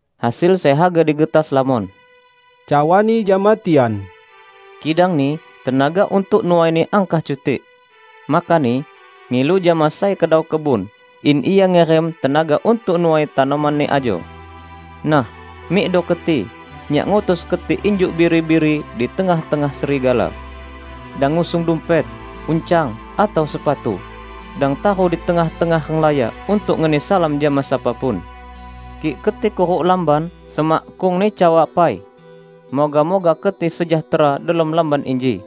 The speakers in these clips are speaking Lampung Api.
"Hasil sai haga digetas lamon," cawa-Ni jama tian, "kidangni tenaga untuk nuaini angkah cutik. Makani, ngilu jama sai Kedau kebun in Ia ngirim tenaga untuk nuai tanoman-Ni ajo. Nah, mikdo keti! Nyak ngutus keti injuk biri-biri di tengah-tengah serigala. Dang ngusung dumpet, uncang, atau sepatu. Dang taru di tengah-tengah renglaya untuk ngeni salam jama sapa pun. Kik keti kuruk lamban, semakkungni cawa pai, 'Moga-moga keti sejahtera delom lamban inji.'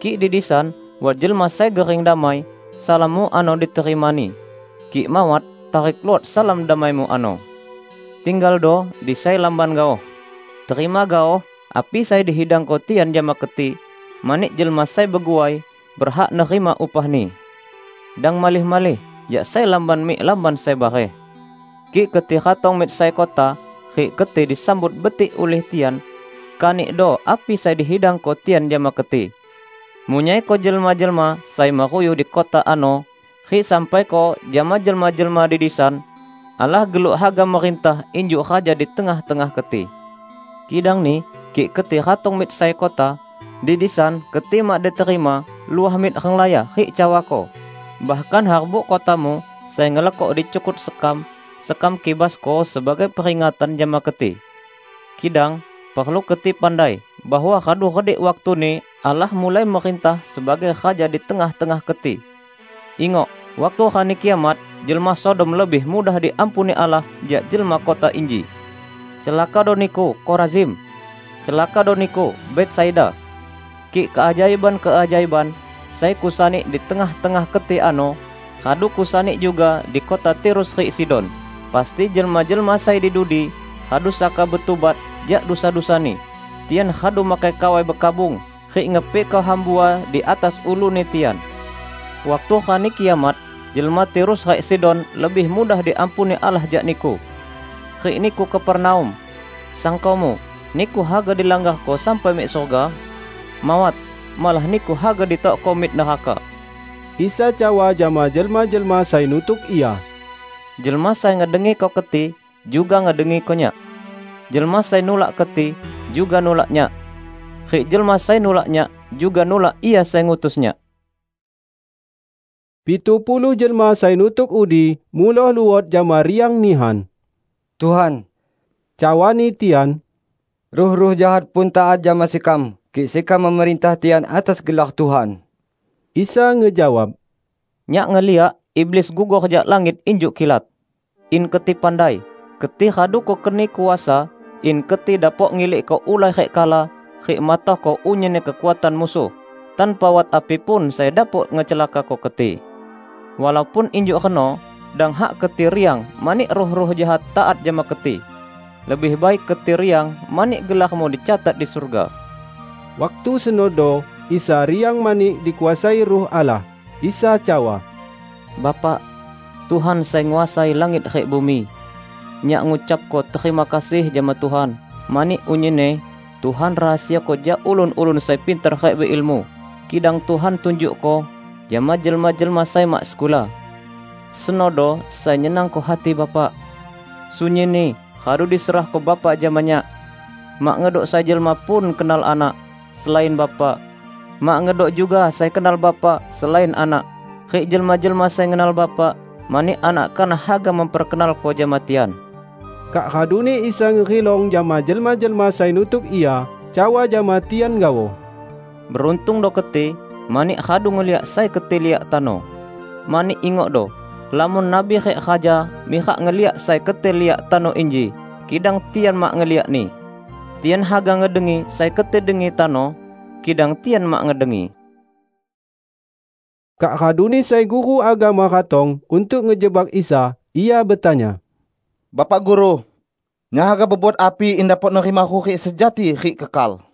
Kik di disan wat jelma sai gering damai, salammu ano diterimani; kik mawat, tarik luot salam damaimu ano. Tinggaldo di sai lamban gaoh. Terima gaoh api sai dihidangko tian jama keti, mani jelma sai beguai berhak nerima upahni. Dang malih-malih jak sai lamban mik lamban sai bareh. Kik keti ratong mik sai kota rik keti disambut betik ulih tian, kanikdo api sai dihidangko tian jama keti. Munyaiko jelma-jelma sai meruyuh di kota ano, rik sampaiko jama jelma-jelma di disan, 'Allah geluk haga merintah injuk Raja di tengah-tengah keti.' Kidangni kik keti ratong mik sai kota, di disan keti mak diterima, luah mik renglaya rik cawako, 'Bahkan harbuk kotamu sai ngelekok dicukut sekam, sekam kibasko sebagai peringatan jama keti!' Kidang perlu keti pandai bahwa radu redik waktuni Allah mulai merintah sebagai Raja di tengah-tengah keti! Ingok, waktu Rani Kiamat, jelma Sodom lebih mudah diampuni Allah jak jelma kota inji!" "Celakado niku, Korazim! Celakado niku, Betsaida! Kik keajaiban-keajaiban sai kusani di tengah-tengah keti ano radu kusani juga di kota Tirus rik Sidon, pasti jelma-jelma sai di dudi radu saka betubat jak dusa-dusani, tian radu makai kawai bekabung rik ngepikko hambua di atas uluni tian. Waktu Rani Kiamat, jelma Tirus rik Sidon lebih mudah diampuni Allah jak niku. Rik niku, Kapernaum! Sangkomu, niku haga dilanggarko sampai mik surga? Mawat! Malah niku haga ditokko mik neraka!" Isa cawa jama jelma-jelma sai nutuk Ia, "Jelma sai ngedengiko keti, juga ngedengiko Nyak. Jelma sai nulak keti, juga nulak Nyak. Rik jelma sai nulak Nyak, juga nulak Ia sai ngutus Nyak." Pitu puluh jelma sai nutuk udi, muloh luot jama riang nihan. "Tuhan," cawani tian, "ruh-ruh jahat pun taat jama sekam kik sekam memerintah tian atas gelar Tuhan!" Isa ngejawab, "Nyak ngeliak iblis gugor jak langit injuk kilat. In keti pandai! Keti radu Kukeni kuasa in keti dapok ngilikko ulai rik kala rik matohko unyinni kekuatan musuh, tanpa wat api pun sai dapok ngecelakako keti. Walaupun injuk reno dang hak keti riang mani ruh-ruh jahat taat jama keti. Lebih baik keti riang mani gelarmu dicatat di surga." Waktu senodo, Isa riang mani dikuasai Ruh Allah. Isa cawa, "Bapak, Tuhan sai nguasai langit rik bumi! Nyak ngucapko terima kasih jama Tuhan mani unyinni Tuhan rahasiako jak ulun-ulun sai pintar rik beilmu, kidang Tuhan tunjukko jama jelma-jelma sai mak sekula. Senodo sai nyenangko hati Bapak. Sunyinni radu diserahko Bapa jama Nyak. Mak ngedok sai jelma pun kenal Anak, selain Bapa. Mak ngedok juga sai kenal Bapa selain Anak; rik jelma-jelma sai ngenal Bapa mani Anak kanah haga memperkenalko jama tian." Kak raduni Isa ngerilong jama jelma-jelma sai nutuk Ia, cawa jama tian gaoh, "Beruntungdo keti mani radu ngeliak sai keti liak tano. Mani ingokdo: Lamon nabi rik raja mirak ngeliak sai keti liak tano inji kidang tian mak ngeliakni. Tian haga ngedengi sai keti dengi tano, kidang tian mak ngedengi." Kak raduni sai guru agama ratong untuk ngejebak Isa. Ia betanya, "Bapak Guru, nyak haga bebuat api in dapok nerima hurik sejati rik kekal?"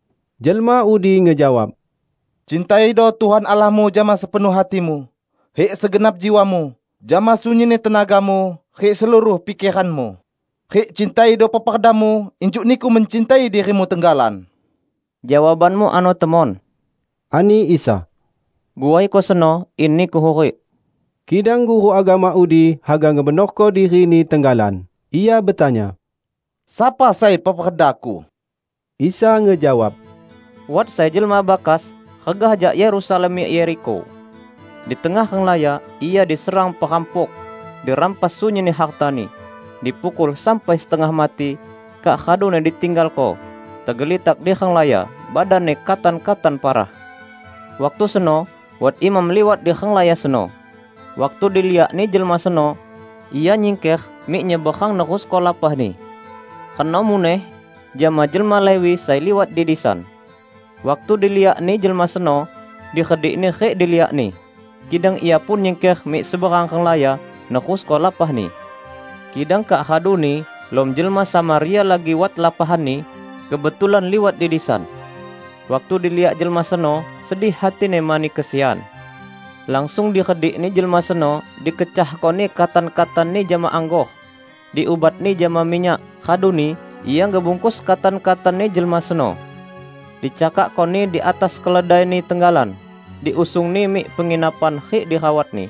Jelma udi ngejawab, " 'Cintaido Tuhan Allahmu jama sepenuh hatimu, rik segenap jiwamu, jama sunyinni tenagamu, rik seluruh pikeranmu,' rik 'Cintaido peperdamu injuk niku mencintai dirimu tenggalan.' " "Jawabanmu ano temon," ani Isa. "Guaiko seno, in niku hurik." Kidang guru agama udi haga ngebenorko dirini tenggalan. Ia betanya, "Sapa sai peperdaku?" Isa ngejawab, "Wat sai jelma bakas regah jak Yerusalem mik Yerikho. Di tengah renglaya ia diserang perampuk, dirampas sunyinni hartani, dipukul sampai setengah mati, kak raduni ditinggalko tegelitak di renglaya badanni katan-katan parah. Waktu seno wat imam liwat di renglaya seno. Waktu diliakni jelma seno, ia nyingker mik nyeberang nerusko lapahni. Reno muneh jama jelma Lewi sai liwat di disan; waktu diliakni jelma seno, diredikni rik diliakni. Kidang ia pun nyingker mik seberang renglaya, nerusko lapahni. Kidang kak raduni lom jelma Samaria lagi wat lapahanni kebetulan liwat di disan. Waktu diliakni jelma seno, sedih hatini mani kesian. Langsung diredikni jelma seno dikecahkoni katan-katanni jama anggor, diubatni jama minyak, raduni ia ngebungkus katan-katanni jelma seno. Dicakakkoni di atas keledaini tenggalan, diusungni mik penginapan rik dirawatni.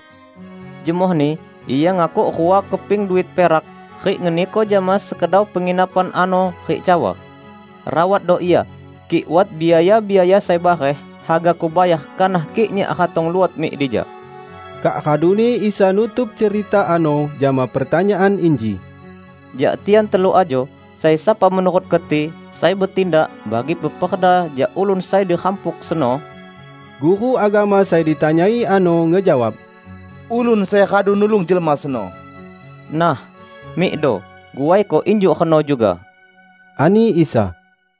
Jemohni ia ngakuk rua keping duit perak rik ngeniko jama sekedau penginapan ano rik cawa, 'Rawatdo ia, kik wat biaya-biaya sai bareh, hagaku bayar kanah kik nyak ratong luot mik dija.' " Kak raduni Isa nutup cerita ano jama pertanyaan inji, "Jak tian telu ajo, sai sapa menurut keti, sai betindak bagi peperda jak ulun sai dirampuk seno?" Guru agama sai ditanyai ano ngejawab, "Ulun sai radu nulung jelma seno." "Nah, mikdo, guaiko injuk reno juga!" ani Isa.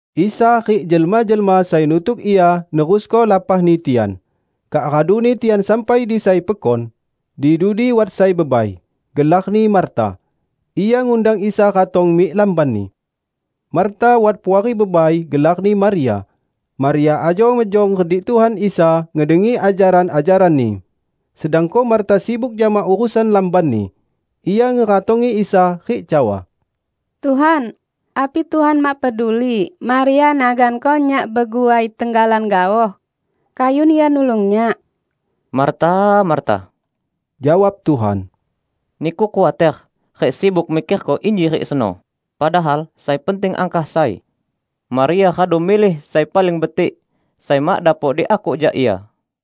Isa rik jelma-jelma sai nutuk Ia nerusko lapahni tian, kak raduni tian sampai di sai pekon. Di dudi wat sai bebai, gelarni Marta. Ia ngundang Isa ratong mik lambanni. Marta wat puari bebai gelarni Maria. Maria ajo mejong redik Tuhan Isa ngedengi ajaran-ajaran-Ni. Sedangko Marta sibuk jama urusan lambanni. Ia ngeratongi Isa rik cawa, "Tuhan, api Tuhan mak peduli Maria naganko nyak beguai tenggalan gaoh? Kayun ia nulung nyak!" "Marta, Marta!" jawab Tuhan. "Niku khuater rik sibuk mikerko inji rik seno; padahal sai penting angkah sai. Maria radu milih sai paling betik, sai mak dapok diakuk jak ia."